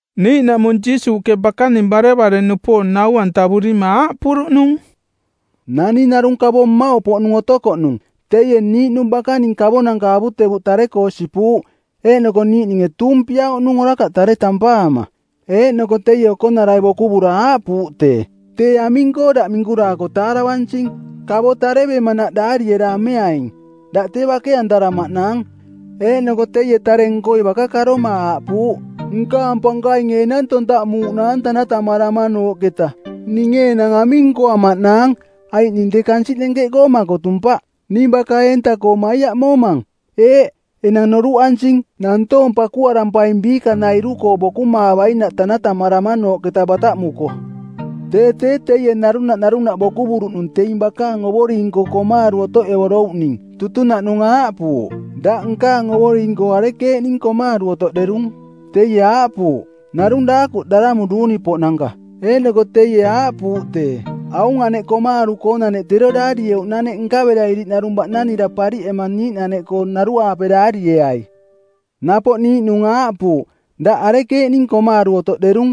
Niiꞌnaꞌmung Jiisuuꞌke bakaning barevare-nupoong nau-antavurima aaꞌpuruꞌnung, “Naning narung kavo mmauꞌ poꞌnung otokoꞌnung. Teie niiꞌnung bakaning kavonanka avutevuꞌ tare-koo sipuuꞌ. Eeꞌnoko niiꞌninge tuumpiauꞌnung orakaꞌ tare tampaama. Eeꞌnoko teie okonarai bokuvura aaꞌpuuꞌ tee, ‘Tee aming-koo daꞌ minkuraako taaravansing? Kavo tarevemanaꞌ daariera ameaing. Daꞌ tee bake-antaramaꞌnaang.’ Eeꞌnoko teie tare-nkoi baka karoma aaꞌpuuꞌ, ‘Nkaang pankainge enang tontaꞌmuuꞌnaang tanatamaramanooꞌketa. Ninge enang aming nkoamaꞌnaang? Aiꞌ ning tee kansiꞌ nenkeꞌkoo makotumpaꞌ. Ning baka-eenta-koo maiaꞌmomang. Eeꞌ, enang noruꞌansing. Nantoong pakuarampaing biikanairu-koo bokumaavainaꞌ tanatamaramanooꞌketa bataꞌmuko.’ “Tee tee teie narunaꞌ narunaꞌ bokuvuruꞌnung teing bakaang ovoring-koo komaaru˜ otoꞌevorouꞌning. Tutunaꞌnung aaꞌpuuꞌ, ‘Daꞌ nkaang ovoring-koo arekeeꞌning komaaru otoꞌderung?’ Teie aaꞌpuuꞌ, ‘Narung daakuꞌ daramu duuni-poꞌnanka.’ Eeꞌnoko teie aaꞌpuuꞌ tee, ‘Aung aneꞌ komaaru-koonaneꞌ tero daarieuꞌnaneꞌ nkavera iriꞌnarung baꞌnanira pariꞌema niiꞌnaneꞌkoo naruaape daarieai.’ “Napoꞌ niiꞌnung aaꞌpuuꞌ, ‘Daꞌ arekeeꞌning komaaru otoꞌderung?’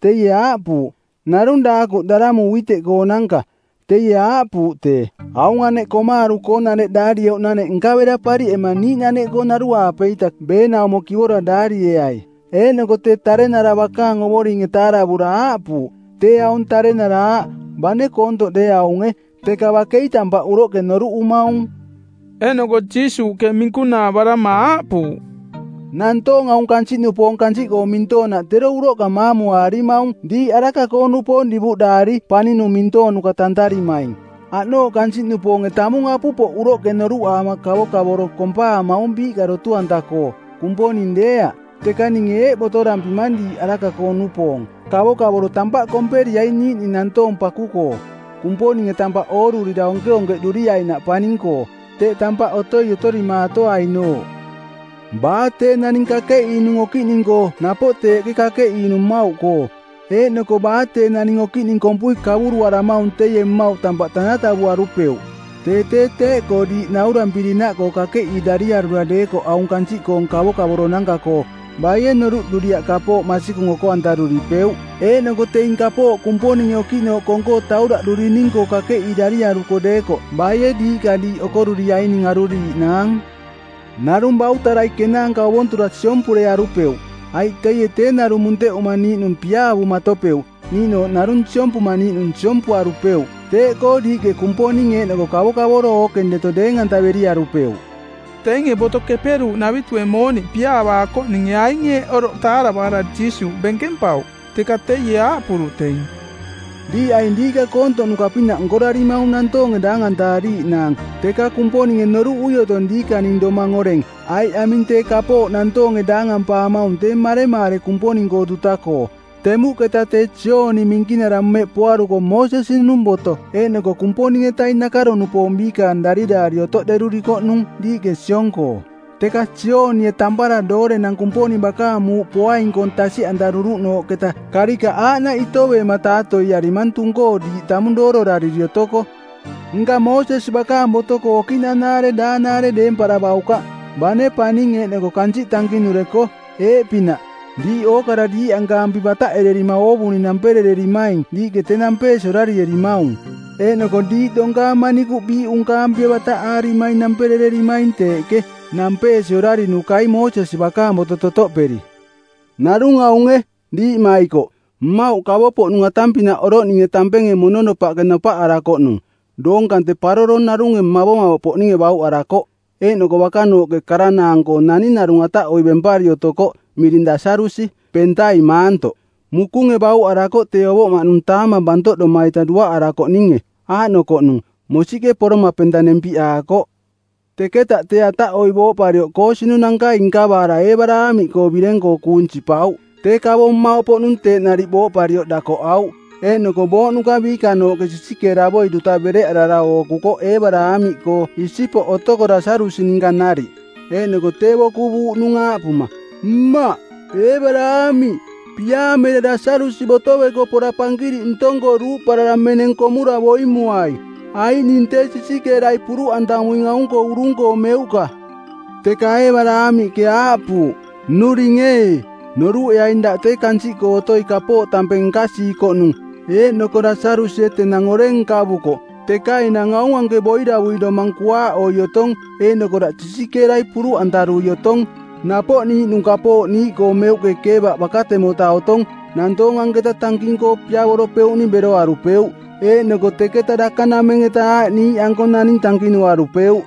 Teie aaꞌpuuꞌ, ‘Narung daakuꞌ daramu uiteꞌkoonanka˜.’ Teie aaꞌpuuꞌ tee, ‘Aung aneꞌ komaaru-koonaneꞌ daarieuꞌnaneꞌ nkavera pariꞌema niiꞌnaneꞌkoo naruaape-ita beenaumo kivora daarieai.’ “Eeꞌnoko tee tarenara bakaang ovoringe taaravura aaꞌpuuꞌ, ‘Tee aung tarenara aaꞌ, bane koontoꞌ deeaunge, teka bakei tampaꞌ uroꞌke noruꞌumaung!’” Eeꞌnoko Jiisuuꞌke minkunaavarama aaꞌpuuꞌ, “Nantoong aung kansiꞌnupoong kansiꞌkoo mintoonaꞌ tero uroꞌka matauaarimaung diiꞌ araka-koo-nupoong divuꞌdaari paninung mintoonuka tantarimaing. Aꞌnooꞌ kansiꞌnupoonge tamung apupoꞌ uroꞌke noruꞌaama kavokavoro kompaamaung biiꞌka dotu-anta-koo, Kumponing deeaꞌ. Teka ninge eeꞌ botorampimang diiꞌ araka-koo-nupoong, kavokavoro tampaꞌ komperiaing niiꞌning nantoong paku-koo, Kumponinge tampaꞌ oorurira onkeonkeꞌduriainaꞌ paning-koo, teꞌ tampaꞌ otoi otorimaatoainooꞌ. “Baa tee naning kakeꞌiinung okiꞌning-koo napoꞌ teeꞌke kakeꞌiinung mmauꞌkoo. Eeꞌnoko baa tee naning okiꞌning kompui kavuruaramaung teie mmauꞌ tampaꞌ tanatavuarupeuꞌ. Tee tee teeꞌkoo diiꞌ naurampirinaꞌkoo kakeꞌiirariarura deekoꞌ aung kansiꞌkoong kavokavoro-nanka-koo, baie noruꞌduriaꞌ kapooꞌ masikung oko-antaruripeuꞌ? Eeꞌnoko teing kapooꞌ Kumponinge okiꞌnooꞌ kong-koo tauraꞌdurining-koo kakeꞌiirariaruko deekoꞌ baie diiꞌka diiꞌ okoruriaining aruriiꞌnaang? Narung bautarai kenaanka ovontura siompurearupeuꞌ, aiꞌ teie tee narung munteꞌuma niiꞌnung piaavumatopeuꞌ, niiꞌnooꞌ narung siompuma niiꞌnung siompuarupeuꞌ. Teeꞌkoo diiꞌke Kumponing eeꞌnoko kavokavoro ookeng deto deeng-antaveriarupeuꞌ.” Teinge Boto Keperuuꞌnavitue mooniꞌ piaavaakoꞌninge aing eeꞌ oroꞌ taaravaara Jiisuuꞌ benkempauꞌ, teka teie aaꞌpuruꞌ teing, “Diiꞌ aing diiꞌka koontoꞌnuka-pinaꞌ nkorarimaung nantoonge daangantaariiꞌnaang, teka Kumponinge noruꞌui otong diikaning domang oreng, aiꞌ aming tee kapooꞌ nantoonge daangampaamaung tee maremaare Kumponing-koo duta-koo. Temuꞌketa tee Jooni Minkinara mmeꞌ poaruko Moosesi-nung boto eeꞌnoko Kumponing-etaing nakaro-nupoong biikaang dariraari otoꞌderurikoꞌnung diiꞌke siong-koo, teka Joonie tampara doorenang Kumponing bakaang muuꞌ poaing-koong tasiꞌantaruruꞌnooꞌketa karikaꞌ aaꞌnaꞌ itoveema taatoiarimang tung-koo diiꞌ tamung doororariri otoko. Nka Moosesi bakaang boto-koo okiꞌnanaare daanaare deemparavaukaꞌ, bane paning eeꞌnoko kansiꞌ tankinureko. Eeꞌpinaꞌ, diiꞌ ookara diiꞌankaampi bataꞌerererima oovuning namperererimaing diiꞌke tee nampeesi orarierimaung. Eeꞌnoko diiꞌ donkaang manikuꞌ biiꞌunkaampie bataꞌaarimaing namperereerimaing teeꞌke, nampeesi orarinukai Moosesi bakaang boto totoꞌperi.” “Narung aunge, diiꞌmaikoꞌ, mmauꞌ kavopoꞌnung atang-pinaꞌ oroꞌninge tampenge mononopaꞌke nopaꞌarakoꞌnung, doong kante paroro narunge mavomavoꞌpoꞌninge bauꞌarakoꞌ. Eeꞌnoko bakanooꞌke karanaang-koo naning narung ataꞌoiꞌ bempari otokoꞌ miring Lasarusi, pentai maantoꞌ. Mukunge bauꞌarakoꞌ tee ovoꞌmaꞌnung taamang bantoꞌdoma-ita duaꞌarakoꞌninge. Aaꞌnokoꞌnung, mosiꞌke poroma penta nempiꞌaakoꞌ. Teketaꞌ tee ataꞌoiꞌ booꞌparioꞌ koosinunankai nkavaara Eebaraamiꞌkoo bireng-koo kuung sipauꞌ. “Tee kavo mmauꞌpoꞌnung teeꞌ nariꞌ booꞌparioꞌ dakoꞌauꞌ. Eeꞌnoko booꞌnuka biikanooꞌke sisikeeravoi duta bereꞌarara ookukoꞌ Eebaraamiꞌkoo isipoꞌ otoko Lasarusi ninka nariꞌ. Eeꞌnoko tee bokuvuuꞌnung aaꞌpuma, ‘Mmaꞌ, Eebaraamiꞌ, piaamera Lasarusi botoveko pora pankiriꞌ ntong-koo duuꞌparara meneng komura boimuai, aiꞌ ning tee sisikeerai puruꞌantamuing aung-koo urung-koo meuꞌka.’ Teka Eebaraamiꞌke aaꞌpuuꞌ, ‘Nnuring ee, noruꞌeaing daꞌ tee kansiꞌkoo otoi kapooꞌ tampeng nkasiikoꞌnung eeꞌnoko Lasarusie tenang oreng nkavukoꞌ, teka enang aung anke boiravui domang kuaaꞌoi otong eeꞌnoko daꞌ sisikeerai puruꞌantarui otong. Napoꞌ niiꞌnung kapooꞌ niiꞌkoo meuꞌke keevaꞌ bakatemota otong nantoong anketa tanking-koo piavoropeuꞌning beroarupeuꞌ, eeꞌnoko teketa dakanameng-eta aaꞌ niiꞌanko naning tankinuarupeuꞌ.’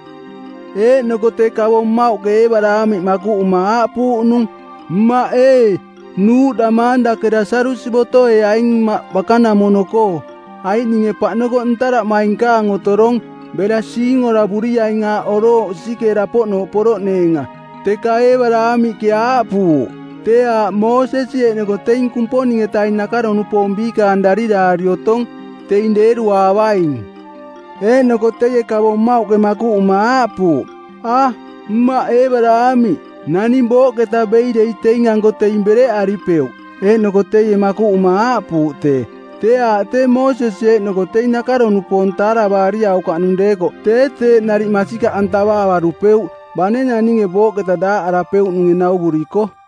“Eeꞌnoko tee kavo mmauꞌke Eebaraamiꞌ makuꞌuma aaꞌpuuꞌnung, ‘Mmaꞌ ee, nuuꞌdamaang dake Lasarusi botoeaing mmaꞌ bakanamono-koo, aiꞌ ninge paꞌnokoꞌ ntaraꞌmainkaang otorong. Bera siingoravuriaing aaꞌ orooꞌ sisikeera-poꞌnooꞌ poroꞌneenga.’ Teka Eebaraamiꞌke aaꞌpuuꞌ, ‘Tee aaꞌ Moosesi eeꞌnoko teing Kumponing-etaing nakaro-nupoong biikaang dariraari otong. Teing deeruaavaing.’ “Eeꞌnoko teie kavo mmauꞌke makuꞌuma aaꞌpuuꞌ, ‘A, mmaꞌ Eebaraamiꞌ, naning booꞌketa bei dei teing-anko teing bereꞌaripeuꞌ.’ Eeꞌnoko teie makuꞌuma aaꞌpuuꞌ tee, ‘Tee aaꞌ tee Moosesi eeꞌnoko teing nakaro-nupoong taaravaariaukaꞌnung deekoꞌ tee teeꞌ nariꞌ masikaꞌantavaavarupeuꞌ, bane naninge booꞌketa daaꞌarapeuꞌnunge nauvuriko.’”